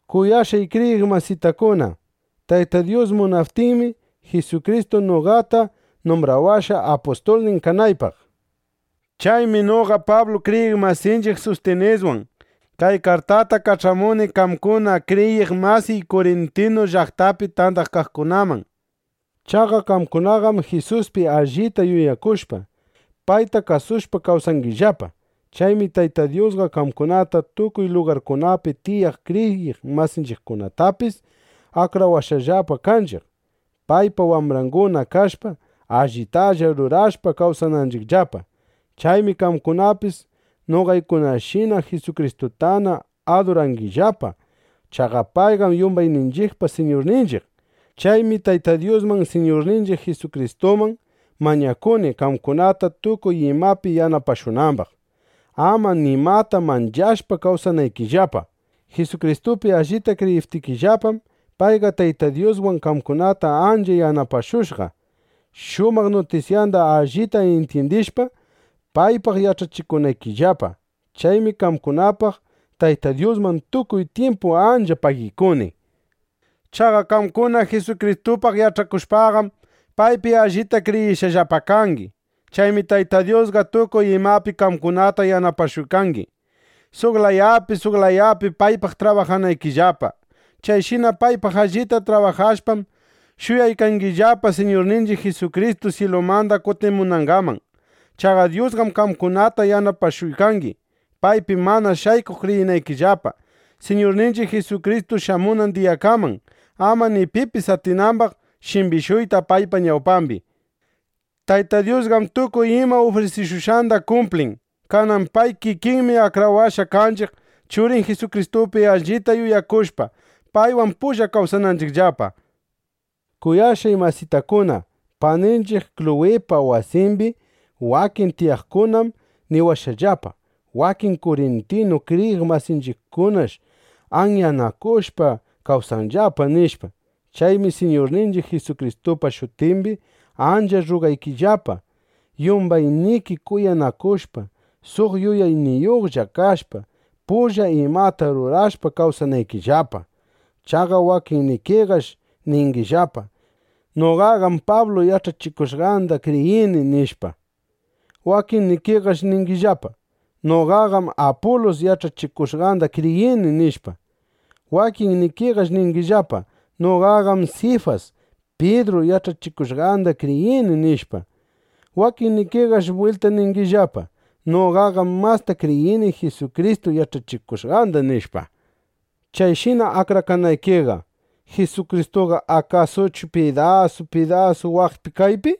(Kuyashqay kriyiq masitakuna,) Tayta Dyus munaptinmi, Jisukristu noqata numbrawashqa, apustulnin kanaypaq. Chaymi noqa Pablu kriyiq masinchiq Sustiniswan kay kartata kach'amuni qamkuna kriyiq masiy Kurintu llaqtapi tandakaqkunaman. Chaqa qamkunaqam Jisuspi allita yuyakushpa, payta kasushpa kawsangillapa. Chaymi Tayta Dyusqa qamkunata, tukuy lugarkunapi tiyaq kriyiq masinchiqkunatapis akrawashqallapa kanchiq, paypa wambranguna kashpa, allitalla rurashpa, kawsananchiqllapa. Chaymi qamkunapis noqaykunashina Jisukristutana adurangillapa. Chaqa payqam yumbayninchiqpa Siñurninchiq. Chaymi Tayta Dyusman, Siñurninchiq Jisukristuman mañakuni, qamkunata tukuy imapi yanapashunambaq, ama nimata manchashpa, kawsanaykillapa. Jisukristupi allita kriyiptikillapam, payqa Tayta Dyuswan qamkunata ancha yanapashushqa, shumaq nutisyanda allita intyindishpa, paypaq yach'achikunaykillapa. Chaymi qamkunapaq Tayta Dyusman tukuy tyimpu ancha pagikuni. Chaqa qamkuna Jisukristupaq yach'akushpaqam, paypi allita kriyishqallapa kangi. Chaymi Tayta Dyusqa tukuy imapi qamkunata yanapashuykangi, suq layapi, suq layapi paypaq trabajanaykillapa. Chayshina paypaq allita trabajashpam, shuyaykangillapa, Siñurninchiq Jisukristu syilumanda kutimunangaman. Chaqa Dyusqam qamkunata yanapashuykangi, paypi mana shaykuq kriyinaykillapa Siñurninchiq Jisukristu shamunan diyakaman, ama ni pipis atinambaq shimbishuyta paypa ñawpambi. Tayta Dyusqam tukuy ima ufrisikushqanda kumplin. Kanan pay kikinmi akrawashqa kanchiq, Churin Jisukristupi allita yuyakushpa, paywan pulla kawsananchiqllapa. Kuyashqay masitakuna, paninchiq Kluwipa wasimbi wakin tiyaqkunam niwashqallapa: Wakin kurintinu kriyiq masinchiqkunash anyanakushpa kawsanllapa, nishpa. Chaymi Siñurninchiq Jisukristupa shutimbi ancha rrugaykillapa, yumbayniki kuyanakushpa, suq yuyayniyuqlla kashpa, pulla imata rurashpa kawsanaykillapa. Chaqa wakinnikiqash ningillapa: “Noqaqam Pablu yach'achikushqanda kriyini”, nishpa. Wakinnikiqash ningillapa: “Noqaqam Apulus yach'achikushqanda kriyini”, nishpa. Wakinnikiqash ningillapa: “Noqaqam Sifas (Pidru) yach'achikushqanda kriyini”, nishpa. Wakinnikiqash bwilta ningillapa: “Noqaqam masta kriyini Jisukristu yach'achikushqanda”, nishpa. Chayshina akrakanaykiqa, ¿Jisukristuqa akasuchu pidasu pidasu, waqpi kaypi?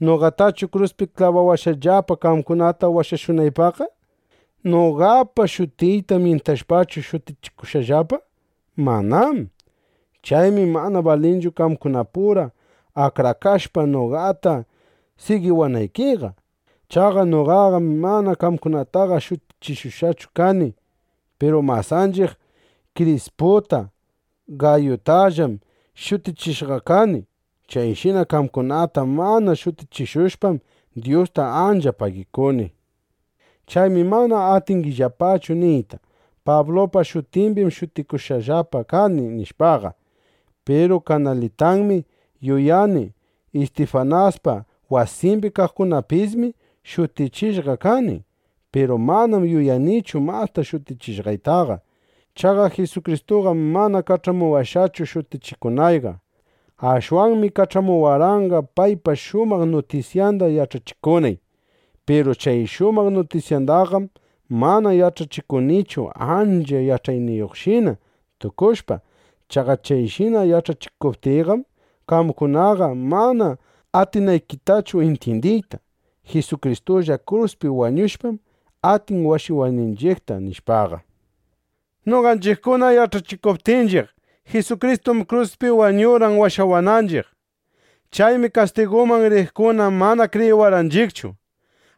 ¿Noqatachu kruspi klabawashqallapa, qamkunata washashunaypaqqa? ¿Noqapa shutiyta myintashpachu shutichishushqallapa? ¡Manám! (Chaymi mana balinchu qamkunapura akrakashpa, noqata sigiwanaykiqa.) Chaqa noqaqam mana qamkunataqa shutichishushqachu kani. Piru masanchiq Krisputa, Gayutallam shutichishqaqa kani. Chayshina qamkunata mana shutichishushpam, Dyusta ancha pagikuni. Chaymi mana atingillapachu niyta: “Pablupa shutimbim shutikushqallapa kani”, nishpaqa. Piru kanalitanmi yuyani, Istifanaspa wasimbi kaqkunatapismi shutichishqa kani. Piru manam yuyanichu masta shutichishqaytaqa. Chaqa Jisukristuqam mana kach'amuwashqachu shutichikunayqa. Ashwanmi kach'amuwarqanqa, paypa shumaq nutisyanda yach'achikunay. Piru chay shumaq nutisyandaqam mana yach'achikunichu ancha yach'ayniyuqshina tukushpa. Chaqa chayshina yach'achikuptiyqam, qamkunaqa mana atinaykitachu intyindiyta: Jisukristulla kruspi wañushpam, atin washawayninchiqta, nishpaqa. Noqanchiqkuna yach'achikuptinchiq: “Jisukristum kruspi wañurqan, washawananchiq”, nishpaqa, kastiguman riqkuna mana kriyiwanchiqchu.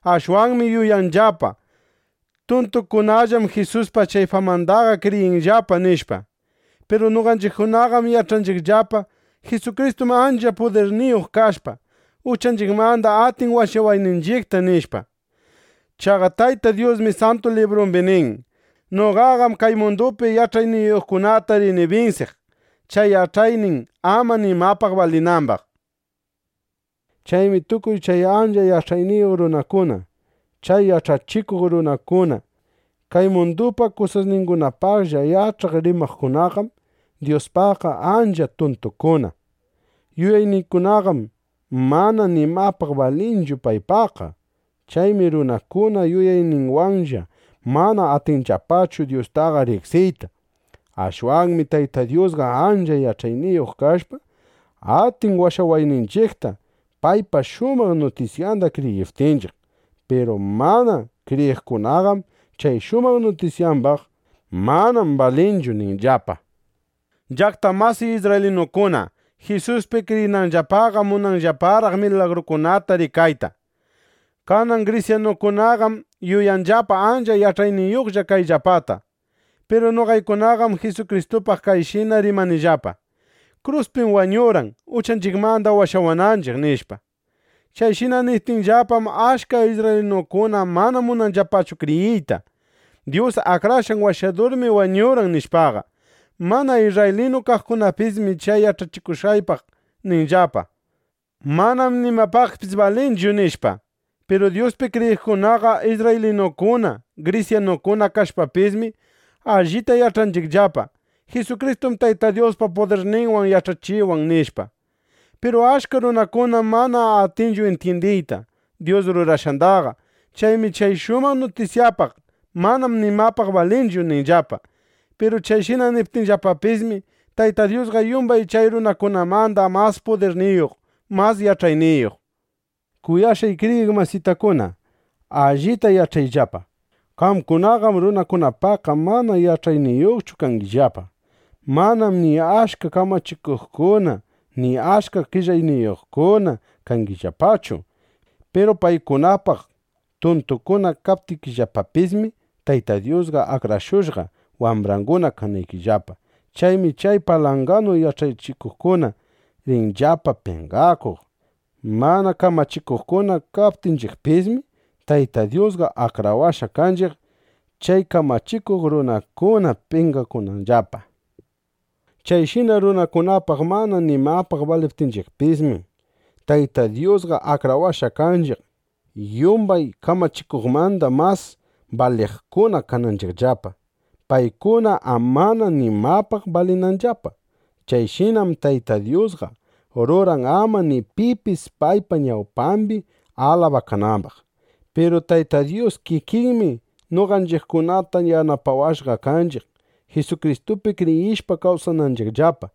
Ashwanmi yuyanllapa: Tuntukunallam Jisuspa chay famandaqa kriyinllapa, nishpa. Piru noqanchiqkunaqam yach'anchiqllapa: Jisukristum ancha pudirniyuq kashpa, uchanchiqmanda atin washawayninchiqta, nishpa. Chaqa Tayta Dyusmi Santu Librumbi nin: Noqaqam kay mundupi yach'ayniyuqkunata rini binsiq, chay yach'aynin ama nimapaq balinambaq, nishpa. Chaymi tukuy chay ancha yach'ayniyuq runakuna, chay yach'achikuq runakuna, kay mundupa kusasningunapaqlla yach'aq rimaqkunaqam Dyuspaqqa ancha tuntukuna. Yuyayningunaqam mana nimapaq balinchu paypaqqa. Chaymi runakuna yuyayninwanlla mana atinllapachu Dyustaqa riqsiyta. Ashwanmi Tayta Dyusqa ancha yach'ayniyuq kashpa, atin washawayninchiqta, paypa shumaq nutisyanda kriyiptinchiq. Piru mana kriyiqkunaqam chay shumaq nutisyambaq: “Manam balinchu” ninllapa. Llaqta masiy isrraylinukuna, Jisuspi kriyinanllapaqam munanllaparaq milagrukunata rikayta. Kanan grisyanukunaqam, yuyanllapa ancha yach'ayniyuqlla kayllapata. Piru noqaykunaqam Jisukristupaq kayshina rimanillapa: “Kruspim wañurqan, uchanchiqmanda washawananchiq”, nishpa. Chayshina niptiyllapam, achka isrraylinukuna mana munanllapachu kriyiyta: Dyus Akrashqan Washadurmi wañurqan, nishpaqa. Mana isrraylinu kaqkunapismi chay yach'achikushqaypaq ninllapa: “Manam nimapaqpis balinchu”, nishpa. Piru Dyuspi kriyiqkunaqa isrraylinukuna, grisyanukuna kashpapismi, allita yach'anchiqllapa: Jisukristum Tayta Dyuspa pudirninwan yach'ayninwan, nishpa. Piru achka runakunam mana atinchu intyindiyta Dyus rurashqandaqa. Chaymi chay shumaq nutisyapaq: “Manam nimapaq balinchu”, ninllapa. Piru chayshina niptinllapapismi, Tayta Dyusqa yumbay chay runakunamanda mas pudirniyuq mas yach'ayniyuq. Kuyashqay kriyiq masitakuna, allita yach'ayllapa: Qamkunaqam runakunapaqqa mana yach'ayniyuqchu kangillapa. Manam ni achka kamachikuqkuna, ni achka qellayniyuqkuna kangillapachu. Piru paykunapaq tuntukuna kaptikillapapismi, Tayta Dyusqa akrashushqa, wambranguna kanaykillapa. Chaymi chay palanganu yach'ayniyuqkuna rinllapa penqakuq. Mana kamachikuqkuna kaptinchiqpismi, Tayta Dyusqa akrawashqa kanchiq, chay kamachikuq runakuna penqakunanllapa. Chayshina runakunapaq mana nimapaq baliptinchiqpismi, Tayta Dyusqa akrawashqa kanchiq, yumbay kamachikuqmanda mas baliqkuna kananchiqllapa, paykuna amana nimapaq balinanllapa. Chayshinam Tayta Dyusqa ruran, ama ni pipis paypa ñawpambi alabakanambaq. Piru Tayta Dyus kikinmi noqanchiqkunata yanapawashqa kanchiq, Jisukristupi kriyishpa kawsananchiqllapa.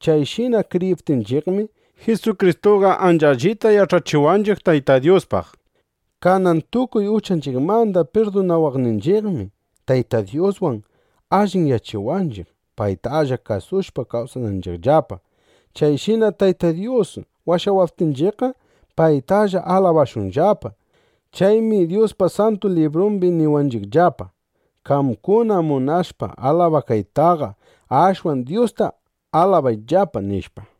Chayshina kriyiptinchiqmi, Jisukristuqa ancha allita yach'achiwanchiq Tayta Dyuspaq. Kanan tukuy uchanchiqmanda pirdunawaqninchiqmi, Tayta Dyuswan alliyachiwanchiq, paytalla kasushpa kawsananchiqllapa. Chayshina Tayta Dyus washawaptinchiqqa, paytalla alabashunllapa. Chaymi Dyuspa Santu Librumbi niwanchiqllapa: “Qamkuna munashpa alabakaytaqa, ashwan Dyusta alabayllapa”, nishpa.